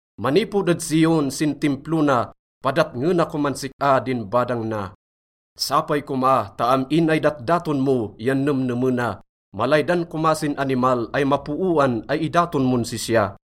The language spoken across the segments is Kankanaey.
Manipod ed Zion sin Timplo na, padatngena koman sik-a din badang na. Sapay koma ta am-in ay datdaton mo yan nemnemena, malaydan koma sin animal ay mapooan ay idaton mon sisya.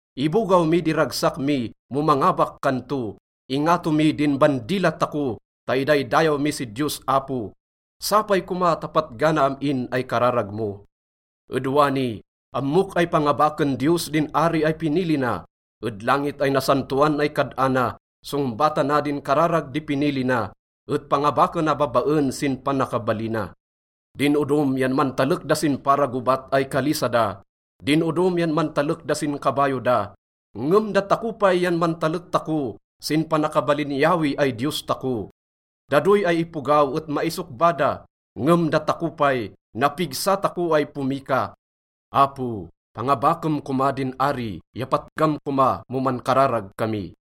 Ibogaw mi di ragsak mi mo mangabak kan to, ingato mi din bandila tako ta idaydayaw mi si Diyos Apo. Sapay koma ta patgana am-in ay kararag mo. Ed wani, ammok ay pangabaken Diyos din ari ay pinili na. Ed langit ay nasantoan ay kad-ana, songbatana din kararag di pinili na, et pangabakena babaen sin panakabalina. Din odom yan mantalek da sin para gobat ay kalisa da, din odom yan mantalek da sin kabayo da, ngem datako pay yan mantalek tako sin panakabalin Yahweh ay Diyos tako. Da doy ay ipogaw et maisokba da, ngem datako pay, napigsa tako ay pomika. Apo, pangabakem koma din ari ya patgam koma mo mankararag kami.